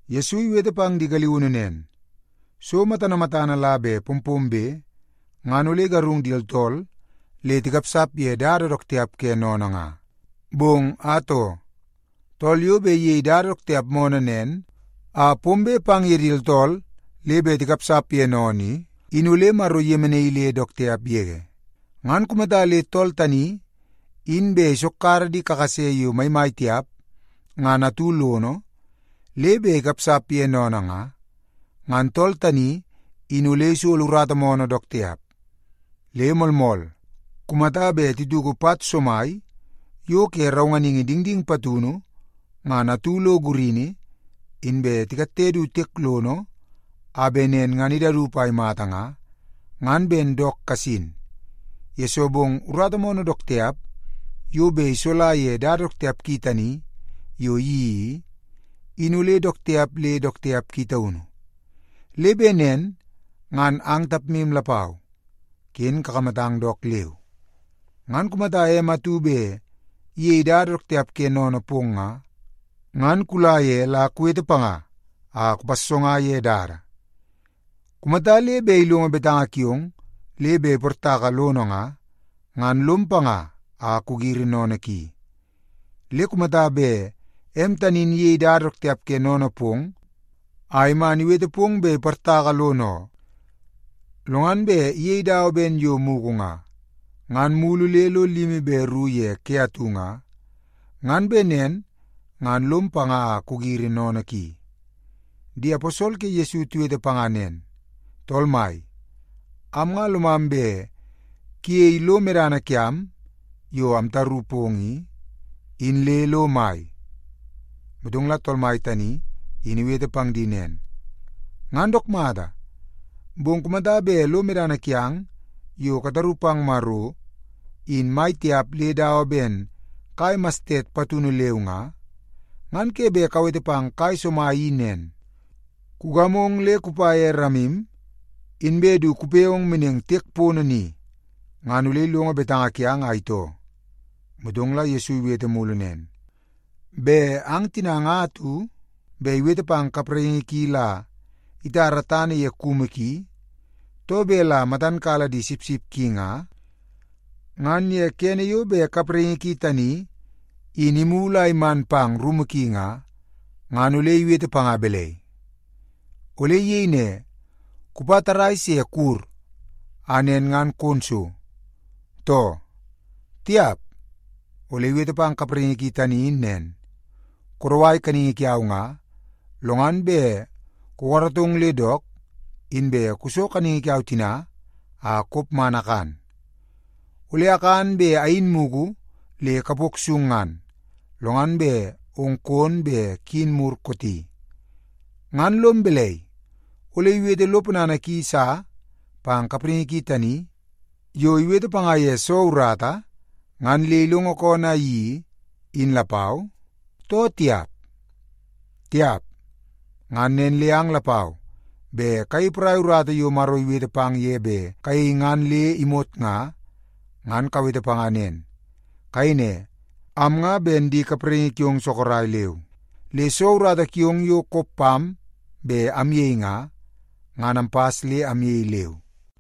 Yesu iwete pang di galiunu nen, “So matana matana la bet pompombe, ngan ole igarung di tooltool le tikapsap ye dada dook tiap ke sennene nga. Bong atoo, tool yo bet iyei dada dook tiap moonoo nen a pombe pang ye di tooltool le bet tikapsap ye sennene i, in ole Maro iyemenaii le dook tiap yege. Ngan kumata le tool tani in bet isokkara di kakase yo maimai tiap ngan atu lono, le bet ikapsap ye sennene nga, ngan tool tani in ole isolo urata moonoo dook tiap. Le moolmool, kumata bet tituku pat somai yo ke raunganingi dingding patunu ngan atu lo gurini, inbe tikatte du tiek lono a bet nen ngan idaup a imata nga, ngan ben dook kasin, yesoo bong urata moonoo dook tiap yo bet isola ye dada dook tiap ki tani yo iyeii i, in ole dook tiap le dook tiap ki taunu. Le bet nen ngan ang tapmu lapau, ken kakamatang dook leu. “Ngan kumata em atu bet iyei dada dook tiap ke sennene pong nga, ngan kula ye la kuwete panga a kupassonga ye dada. Kumata le bet ilongo betanga kiong le bet iportaka lono nga, ngan lom panga a kugiri sennene ki. Le kumata bet em tani in iyei dada dook tiap ke sennene pong a iman iwete pong bet iportaka lono oo, lo ngan bet iyei dawa ben yo mugu nga, ngan mulu le lo limi be ru ye ke atu nga, ngan bet nen ngan lom panga a kugiri sennene ki.” Di aposol ke Yesu tiwete panga nen, “Tool Mai, am nga lomam bet kuyeie lo medana kiam yo amtaru pong i, in le lo mai.” Motong la Tool Mai tani in iwete pang di nen, “Ngan dook mata, bong kumata bet lo medana kiang yo kataru pang Maro, in mai tiap le dawa ben kai mastet patunu leu nga, ngan ke bet kawete pang kai somai i nen, ‘Kugamong le kupa ye ramim, inbe du kupe ong meneng tiek pono ni,’ ngan ole ilongo betanga kiang a itoo.” Motong la Yesu iwete mulu nen, “Bet ang tina nga atu bet iwete pang kapraingi ki la itara tana ye kumu ki, too bet la matan kala di sipsip ki nga, ngan ye kene yo bet kapraingi ki tani in imulu a iman pang rumu ki nga, ngan ole iwete panga balai? Ole iyei ne, ‘Kupa tarrai se kuwur, a nen ngan kon so,’ too? Tiap! Ole iwete pang kapraingi ki tani in nen, ‘Kudawai kaningi kiau nga, lo ngan bet kukaratong le dook, inbe kuso kaningi kiau tina a kop man akan. Ole akan be ayin mugu le kapok sung ngan, lo ngan bet ong kon be kuyin mur kooti.’ Ngan lom balai, ole iwete lo ponana ki sa pang kapraingi ki tani yo iwete panga ye soo urata ngan le ilongo koonoo a iyeii, in lapau, too tiap? Tiap! Ngan nen le ang lapau bet kayei porai urata yo Maro iwete pang ye bet kayei ngan le imot nga, ngan kawete panga nen. Kayei ne, ‘Am nga ben di kapraingi kiong sorok leu, le soo urata kiong yo kop pam bet amyei nga, ngan ampas le amyei leu.’”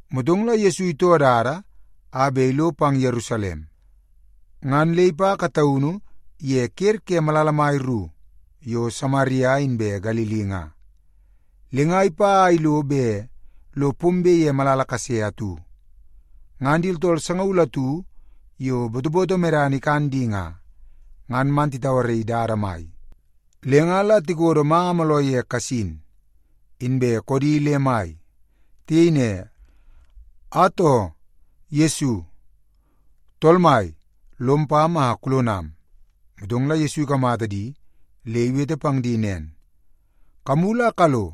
Motong la Yesu itoo dada a bet ilo pang Yerusalem. Ngan le ipa kataunu ye ker ke malala mai ru yo Samaria inbe Galili nga. Le nga ipa a ilo bet lo pombe ye malala kase atu, ngan di tooltool sangaul atu yo botoboto medana ikan di nga, ngan man titauaraii dada mai. Le nga la tikodo manga mooloo ye kasin, inbe koodi le mai. Tiyei ne, “Atoo, Yesu! Tool mai, lom pam a kulonam!” Motong la Yesu ikamata di le iwete pang di nen, “Kamulu a kalo,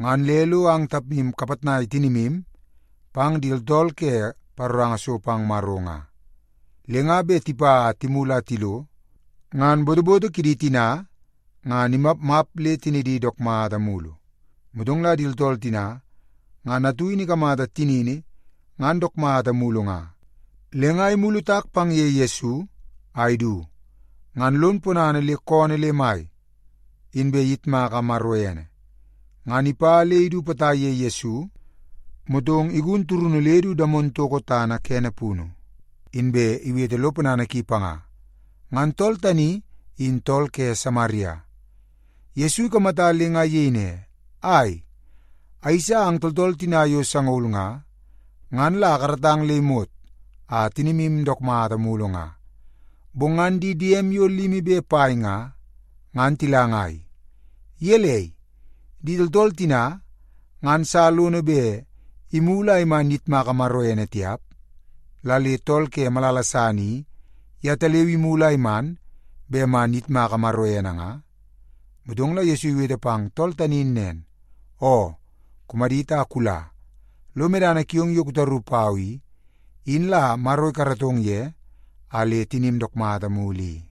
ngan le lo ang tapmu kapitnai tinimu pang di tooltool ke paroranga so pang Maro nga.” Le nga bet tipa a timulu a tilo, ngan botoboto kidi tina ngan imapmap le tinidi dook mata mulu. Motong la di tooltool tina ngan atu in ikamata tinini ngan dook mata mulu nga, le nga imulu tak pang ye Yesu a idu, ngan lon ponana le koonoo le mai, inbe iyitmaka Maro ene. Ngan ipa le idu potai ye Yesu, motong igun turunu le du damon toko tana kene punu, inbe iwete lo ponana ki panga. Ngan tool tani in tool ke Samaria. Yesu ikamata le nga iyei ne, “Ai, ayeisa ang tooltool tina yo sangaul nga, ngan la akaratang le imot a tinimu dook mata mulu nga. Bong ngan di diem yo limi be pai nga, ngan tila ngai? Gelei, di tooltool tina ngan sa lono bet imulu a iman iyitmaka Maro ene tiap, la le tool ke malala san i, yetaleu imulu a iman bet man iyitmaka Maro ene nga?” Motong la Yesu iwete pang tool tani in nen, “Oo, kumadit a kula. Lo medana kiong yo kutaru pau i, in la Maro ikaratong ye a le tinim dook mata mulu i.”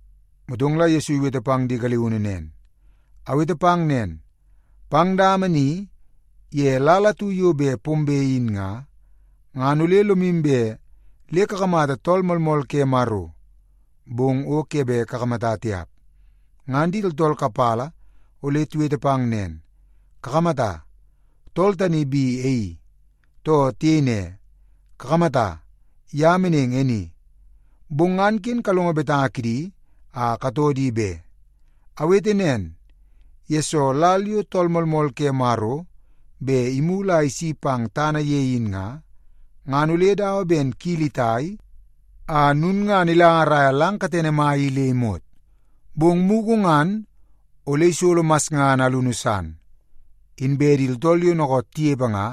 Motong la Yesu iwete pang di galiunu nen, “Awete pang nen, pang dama ni ye lal atu yo bet pombe in nga, ngan ole lomu bet le kakamata Tool Moolmool ke Maro, bong o ke bet kakamata tiap. Ngan di tooltool kapala ole tiwete pang nen, ‘Kakamata, tool tani bi e i,’ too tiyei ne, ‘Kakamata, ye meneng e ni.’ Bong ngan ken kalongo betanga kidi a katoo di be. Awete nen, yesoo lal yo Tool Moolmool ke Maro bet imulu a isi pang tana ye in nga, ngan ole dawa ben kili itai a lulngana ilangaraia lang katene mai i le imot. Bong mugu ngan ole isolo masngana alunu san, inbe di tooltool yo dookoot tinepe nga,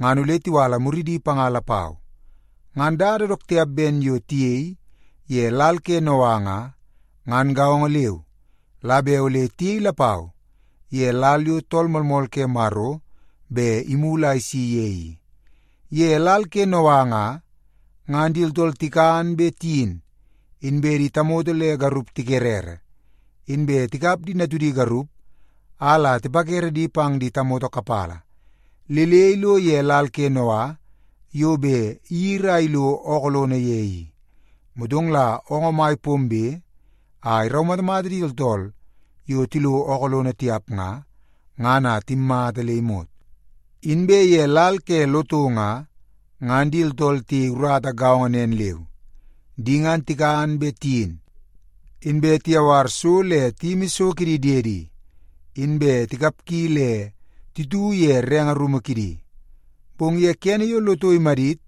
ngan ole tiwala muridi panga lapau. “Ngan dada dook tiap ben yo tiyei ye lal ke Noa nga, ngan gaongo leu la bet ole tiyei lapau ye lal yo Tool Moolmool ke Maro bet imulu a isi ye i. Ye lal ke Noa nga, ngan di tooltool tikan be tiyin, inbe tamoto le garup tikerere, inbe tikap di natudi garup a la tipakere di pang di tamoto kapala, le le ilo ye lal ke Noa yo bet iyiri a ilo ookoo lono ye i. Motong la oongoo mai pombe a iraumatamata di tooltool yo tilo ookoo lono tiap nga, ngan a timmata le imot. “Inbe ye lal ke Loto nga, ngan di tooltool tiyei urata gaongo nen leu. Di ngan tikan be tiyin, inbe tiyawar so le tiyimi so kidi diedi, inbe tikapgi le titu ye renge rumu kidi. Bong ye kene yo Loto imadit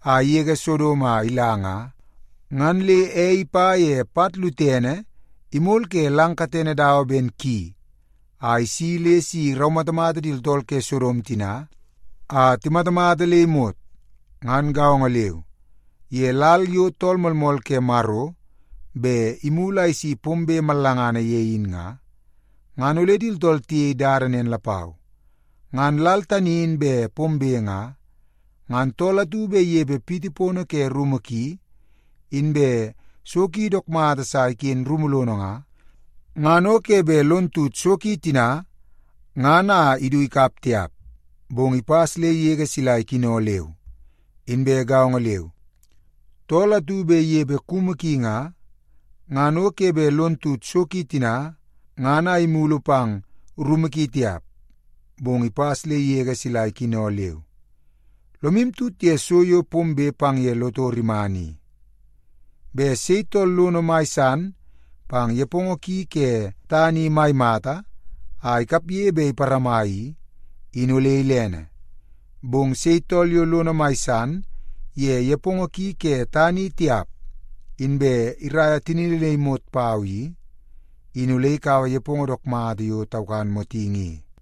a igege Sodom a ila nga, ngan le ei ipa ye pat lutene imol ke lang katene dawa ben ki, a isi le si iraumatamata di tooltool ke Sodom tina a timatamata le imot. “Ngan gaongo leu, ye lal yo Tool Moolmool ke Maro bet imulu a isi pombe mallangana ye in nga, ngan ole di tooltool tiyei dada nen lapau. Ngan lal tani in bet pombe nga, ngan tool atu bet inepe rumu pono ki, inbe so ki dook mata sa iken rumu lono nga, ngan o ke bet lon tut so ki tina ngan a idu ikap tiap, bong ipas le igege sila ikino leu. Inbe gaongo leu, tool atu bet inepe kumu ki nga, ngan o ke bet lon tut so ki tina ngan a imulu pang rumu ki tiap, bong ipas le igege sila ikino leu. Lomu tut ye so yo pombe pang ye Loto rimana i. Bet sei tool lono mai pang nepongo ki ke tana i mai mata a ikapge bet iparama i, in ole ilene. Bong sei tool yo lono mai san ye nepongo ki ke tana i tiap, inbe iraia tinini le imot pau i, in ole ikaua nepongo dook mata yo taukan motingi i.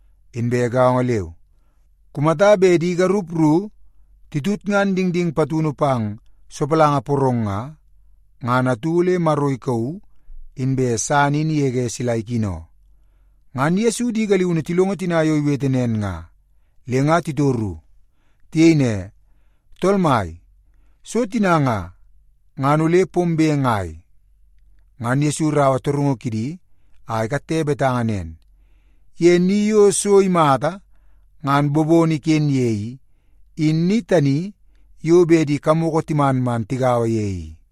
Inbe gaongo leu, kumata bet di garup ru titutngan dingding patunu pang sopalanga porong nga, ngan atu ole Maro ikauu, inbe san in igege sila ikino.” Ngan Yesu di galiunu tilongo tina yo iwete nen nga, le nga titoru. Tiyei ne, “Tool Mai, so tina nga, ngan ole pombe ngai?” Ngan Yesu iraua torungu kidi a ikatte betanga nen, “Ye ni yo so imata ngan bobono iken ye i, in ni tani yo bet di kamoko timan man tigaua ye i.”